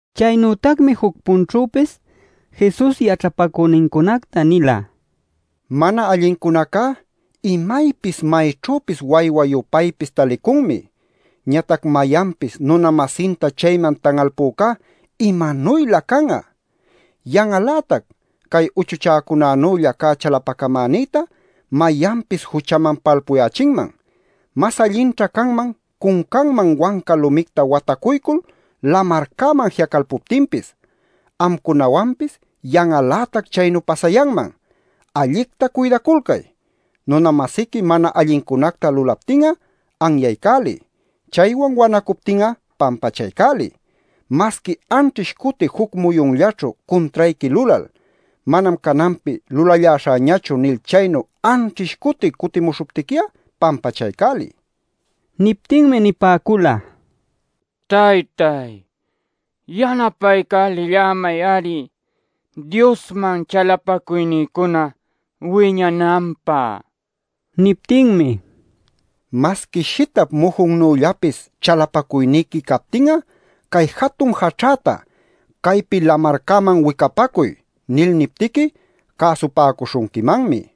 Chaynütacmi juc-punćhüpis Jesus yaćhapacünincunacta nila: “Mana allincunacá imaypis mayćhüpis waywa-yupaypis talicunmi. Ñatac mayanpis nuna-masinta chayman tan'alpücá ¡imanuylä can'a! Yan'al-lätac cay uchuchäcunanülla cä chalapacamänïta mayanpis juchaman palpuyächinman. Mas allinćha canman cuncanman wanca lumicta watacuycul lamarcäman ji'acalpuptinpis. Amcunawanpis yan'al-lätac chaynu pasayanman. Allicta cuydaculcay. “Nuna-masiqui mana allincunacta lulaptin'a anyaycäliy. Chaywan wanacuptin'a pampachaycäliy. Masqui anćhish cuti juc muyunllaćhu cuntrayqui lulal, ‘Manam cananpi lulalläśhäñachu’ nil chaynu anćhish cuti cutimuśhuptiqui'a pampachaycäliy” nila. Niptinmi nipäcula: “Taytáy, yanapaycälillämay-ari Diosman chalapacuynïcuna wiñananpä” nil. Niptinmi: “Masqui shitap mujunnüllapis chalapacuyniqui captin'a cay jatun jaćhäta ‘¡Caypi lamarcäman wicapacuy!’ nil niptiqui cäsupäcuśhunquimanmi” nila.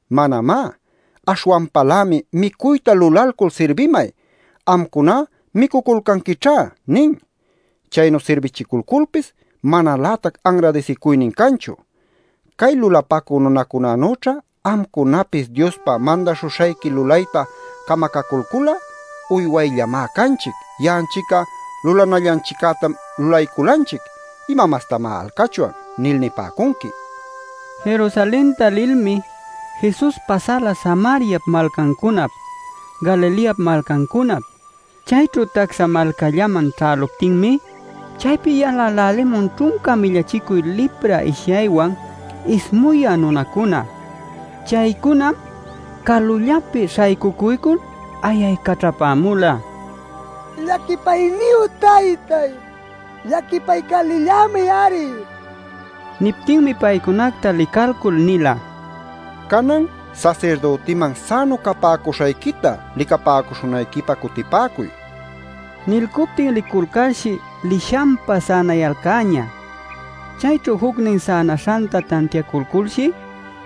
Manamá. Aśhwanpalämi: ‘Micuyta lulalcul sirbimay. Amcuná micuculcanquićhá’ nin. Chaynu sirbichiculculpis manalätac anradisicuynin canchu. Cay lulapacü nunacunanüćha amcunapis Diospa mandäśhuśhayqui lulayta camacalcul'a: ‘Uywayllamá canchic. Ya'anchic'a lulanallanchiccätam lulayculanchic. ¿Ima mastamá alcachwan?’ nil nipäcunqui” nila. Jerusalenta lilmi Jesus pasala Samariap malcancunap, Galileap malcancunap. Chayćhu tacsa malcallaman ćhäluptinmi chaypi yalälälimun ćhunca millachicuy lipra ishyaywan ismuyä nunacuna. Chaycunam calullapi śhaycucuycul ayaycaćhapämula: “Llaquipayniyu taytáy, llaquipaycälillämay-ari” nil. Niptinmi paycunacta licalcul nila: “Canan sasirdütiman sänu capäcuśhayquita licapäcuśhunayquipä cutipäcuy” nil. Nilcuptin liculcalshi lishanpa sänayalcäñä. Chayćhu jucnin sänaśhanta tantiaculculshi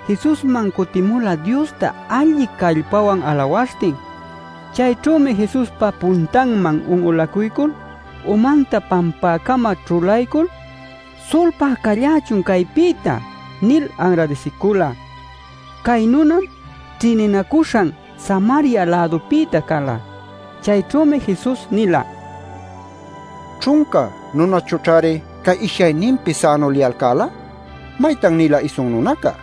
Jesusman cutimula Diosta alli callpawan alawaśhtin. Chayćhümi Jesuspa puntanman un'ulacuycul umanta pampäcama ćhulaycul: “Sulpá callächun caypïta” nil anradisicula. (Cay nunam ćhïninacuśhan Samaria-lädupïta cala.) Chayćhümi Jesus nila: “¿Ćhunca nunachućhari cay ishyayninpi sänu liyalcäla? ¿Maytan-nila isun nunaca?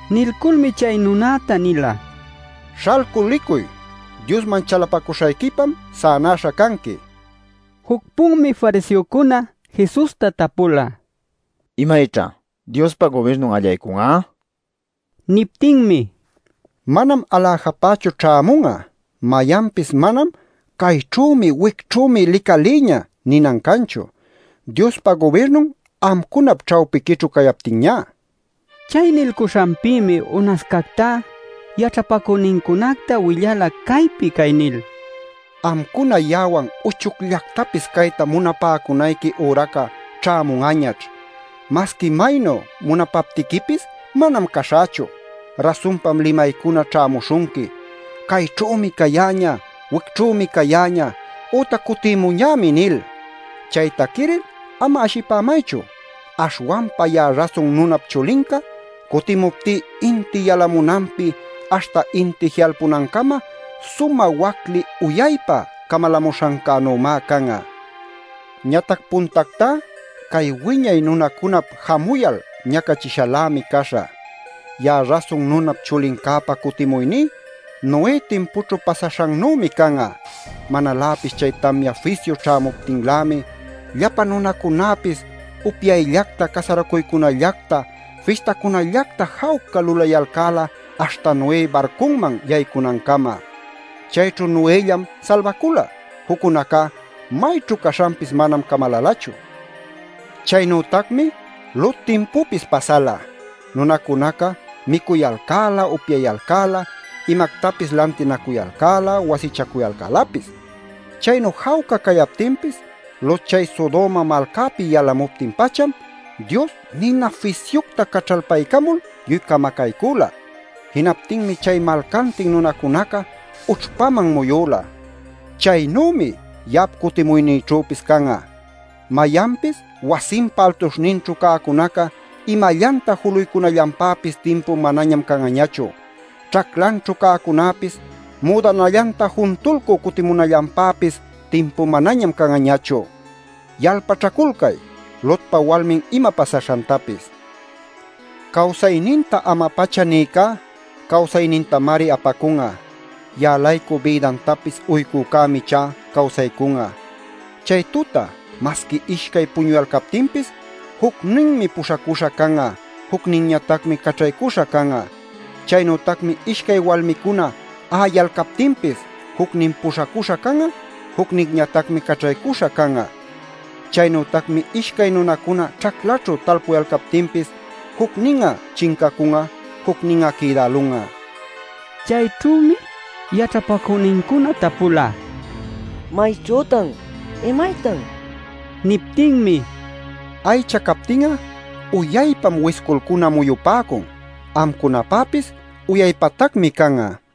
Nilculmi chay nunäta nila: “Śhalcul licuy, Diosman chalapacuśhayquipam sänaśha canqui” nil. Juc-punmi fariseocuna Jesusta tapula: “¿Imayćha Diospa gubirnun allaycun'a?” nil. Niptinmi: “Manam aläjapachu ćhämun'a. Mayanpis manam ‘¡Cayćhümi, wicćhümi licalïñä!’ ninan canchu, Diospa gubirnun amcunap ćhawpiquićhu cayaptinñá” nila. Chay nilcuśhanpïmi unascactá yaćhapacünincunacta willala caypi cay nil: “Amcuna ya'awan uchucllactapis cayta munapäcunayqui üraca ćhämun'añaćh. Masqui maynu munapaptiquipis manam caśhächu. Rasunpam limaycuna ćhämuśhunqui: ‘¡Cayćhümi cayäñä; wicćhümi cayäñä!’ ütac ‘Cutimuñämi’ nil. Chayta quiril ama ashipämaychu. Aśhwanpa ya'a Rasun Nunap Chulinca cutimuptí inti yalamunanpi aśhta inti ji'alpunancama, sumä wacli uyaypa camalämuśhancänümá can'a. Ñatac puntactá cay wiñay nunacunap jamuyal ñacachishalämi caśhä. “Ya'a Rasun Nunap Chulincäpa cutimuyní Noé timpućhu pasaśhannümi can'a. Manaläpis chay tamya fisyu ćhämuptinlämi llapa nunacunäpis upyayllacta, casaracuycunallacta, fistacunallacta jawca lulacuyalcäla aśhta Noé barcunman yaycunancama. Chayćhu Noëllam salbacula; juccunacá mayćhu caśhanpis manam camalalachu. Chaynütacmi Lot timpupis pasala. Nunacunaca micuyalcäla, upyayalcäla, imactapis lantinacuyalcäla, wasichacuyalcälapis. Chaynu jawca cayaptinpis Lot chay Sodoma malcäpi yalamuptin-pacham Dios nina fisyucta caćhalpaycamul lluy camacaycüla. Jinaptinmi chay malcantin nunacunaca ućhpaman muyüla. “Chaynümi ya'ap cutimuynïćhüpis can'a. Mayanpis wasinpa altuśhninćhu cäcunaca imallanta juluycunallanpäpis timpu manañam can'añachu. Ćhaclanćhu cäcunäpis müdanallanta juntulcü cutipämunallanpäpis timpu manañam can'añachu. Yalpaćhaculcay Lotpa walminta ima pasaśhantapis. Cawsayninta ama-pacha nïcá cawsaynintamari apacun'a. Ya'a-laycu bïdantapis uycücämi ichá cawsaycun'a. “Chay tuta masqui ishcay puñuyalcaptinpis jucninmi puśhacuśha can'a, jucninñatacmi caćhaycüśha can'a. Chaynütacmi ishcay walmicuna a'ayalcaptinpis jucnin puśhacuśha can'a, jucninñatacmi caćhaycüśha can'a. ˻ Chaynütacmi ishcay nunacuna ćhaclaćhu talpuyalcaptinpis jucnin'a chincacun'a, jucnin'a quïdälun'a˼” nila. Chayćhümi yaćhapacünincuna tapula: “¿Mayćhütan? ¿Imaytan?” nil. Niptinmi: “Aycha captin'a uyaypam wisculcuna muyupäcun. Amcunapäpis uyaypatacmi can'a” nila.